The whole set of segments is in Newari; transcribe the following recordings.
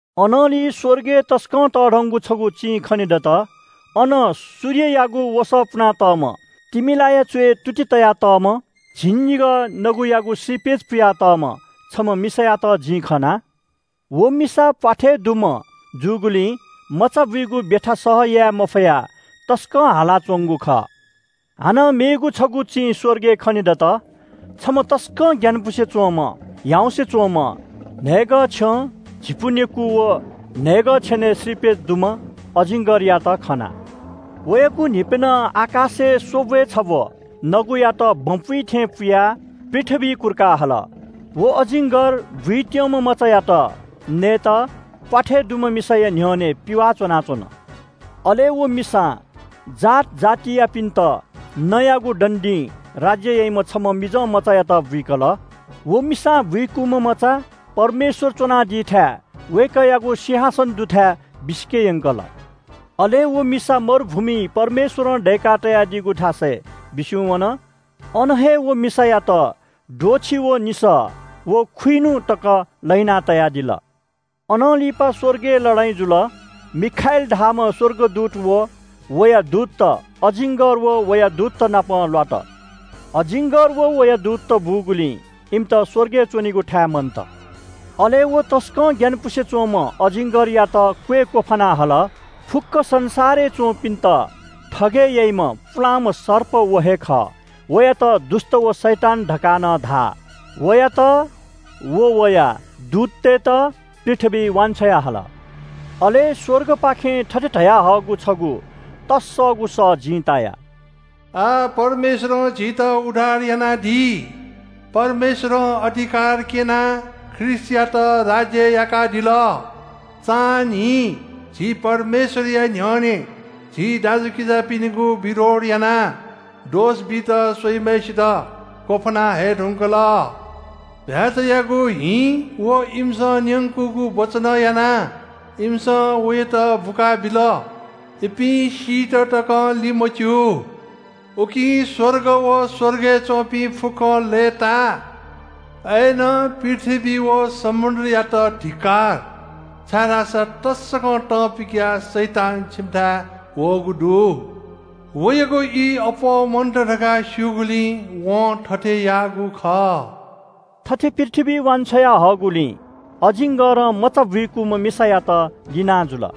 अनंलि स्‍वर्गय् तसकं तःधंगु छगू चिं खनेदत। अन सूर्ययागु वसः पुनातःम्‍ह, तिमिलाया च्‍वय् तुति तयातःम्‍ह, झिंनिगः नगुयागु श्रीपेच पुया तःम्‍ह छम्‍ह मिसायात जिं खना। व मिसा प्‍वाथय् दुम्‍ह जूगुलिं मचाबुइगु ब्‍यथा सह याये मफयाः तसकं हाला च्‍वंगु खः। हानं मेगु छगू चिं स्‍वर्गय् खनेदत। छम्‍ह तसकं ग्‍यानापुसे च्‍वंम्‍ह, ह्याउँसे च्‍वंम्‍ह, न्‍हय्‌गः छ्यं, झिपु नेकू व न्‍हय्‌गः छेनय् श्रीपेच दुम्‍ह अजिङ्गरयात खना। वयागु न्‍हिप्‍यनं आकाशय् स्‍वब्‍वय् छब्‍व नगुयात बँ पुइ थें पुयाः पृथ्‍वीइ कुर्का हल। व अजिङ्गर बुइत्‍यंम्‍ह मचायात नयेत प्‍वाथय् दुम्‍ह मिसाया न्‍ह्यःने पिवाः च्‍वनाच्‍वन। अले व मिसां जात जातियापिन्‍त नँयागु दण्‍डीं राज्‍य याइम्‍ह छम्‍ह मिजंमचायात बुइकल। व मिसां बुइकूम्‍ह मचा परमेश्‍वर च्‍वनादीथाय् वय्‌कःयागु सिंहासन दुथाय् बिसिके यंकल। अले व मिसा मरुभूमिइ परमेश्‍वरं दय्‌का तयादीगु थासय् बिस्‍युं वन। अन हे व मिसायात द्वःछि व निसः व खुइन्‍हु तक लहिना तयादिल। अनं लिपा स्‍वर्गय् लडाइँ जुल। मिखाएल धाःम्‍ह स्‍वर्गदूत व वया दूतत, अजिङ्गर व वया दूतत नाप ल्‍वात। अजिङ्गर व वया दूतत बूगुलिं इमित स्‍वर्गय् च्‍वनेगु थाये मन्‍त। अले व तसकं ग्‍यानापुसे च्‍वंम्‍ह अजिङ्गरयात क्‍वय् क्‍वफाना हल। फुक्‍क संसारय् च्‍वंपिन्‍त थगय् याइम्‍ह पुलांम्‍ह सर्प व हे खः। वयात दुष्‍ट व शैतान धकाः नं धाः। वयात व वया दूततय्‌त पृथ्‍वीइ वान्‍छ्वया हल। अले स्‍वर्गपाखें थथे धयाहःगु छगू तस्‍सःगु सः जिं ताया – “आः परमेश्‍वरं झीत उद्धार यानादी। परमेश्‍वरं अधिकार क्‍यनाः ख्रीष्‍टयात राज्‍य याकादिल। चान्‍हिं झी परमेश्‍वरया न्‍ह्यःने झी दाजुकिजापिनिगु विरोध यानाः दोष बीत स्‍वइम्‍हय्‌सित क्‍वफाना हये धुंकल। चीधिकःम्‍ह भ्‍याःचायागु हिं व इमिसं न्‍यंकूगु वचनं यानाः इमिसं वयात बुकाबिल। इपिं सीत तकं लिमच्‍यू। उकिं स्‍वर्ग व स्‍वर्गय् च्‍वंपिं फुक्‍कं लय्‌ताः। अय्‌नं पृथ्‍वी व समुद्रयात धिक्‍कार, छाय्‌धाःसा तसकं तं पिकयाः शैतान छिमिथाय् वःगु दु। वयागु ई अप्‍वः मन्‍त धकाः स्‍यूगुलिं वं थथे याःगु खः।” थथे पृथ्‍वीइ वान्‍छ्वया हःगुलिं अजिङ्गरं मचा बुइकूम्‍ह मिसायात लिनाजुल।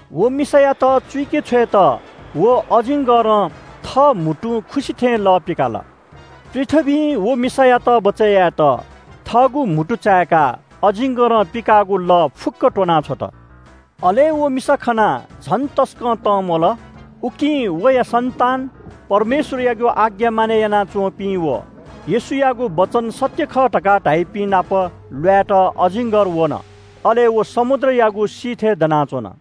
व मिसायात चुइके छ्वयेत व अजिङ्गरं थःगु म्‍हुतुं खुसि थें लः पिकाल। पृथ्‍वीं व मिसायात बचय् यायेत थःगु म्‍हुतु चाय्‌काः अजिङ्गरं पिकाःगु लः फुक्‍क त्‍वनाछ्वत। अले व मिसा खनाः झन तसकं तंम्‍वल। उकिं वया सन्‍तान, परमेश्‍वरयागु आज्ञा मानय् यानाच्‍वंपिं व येशूयागु वचन सत्‍य खः धकाः धाइपिं नाप ल्‍वायेत अजिङ्गर वन। अले व समुद्रयागु सिथय् दनाच्‍वन।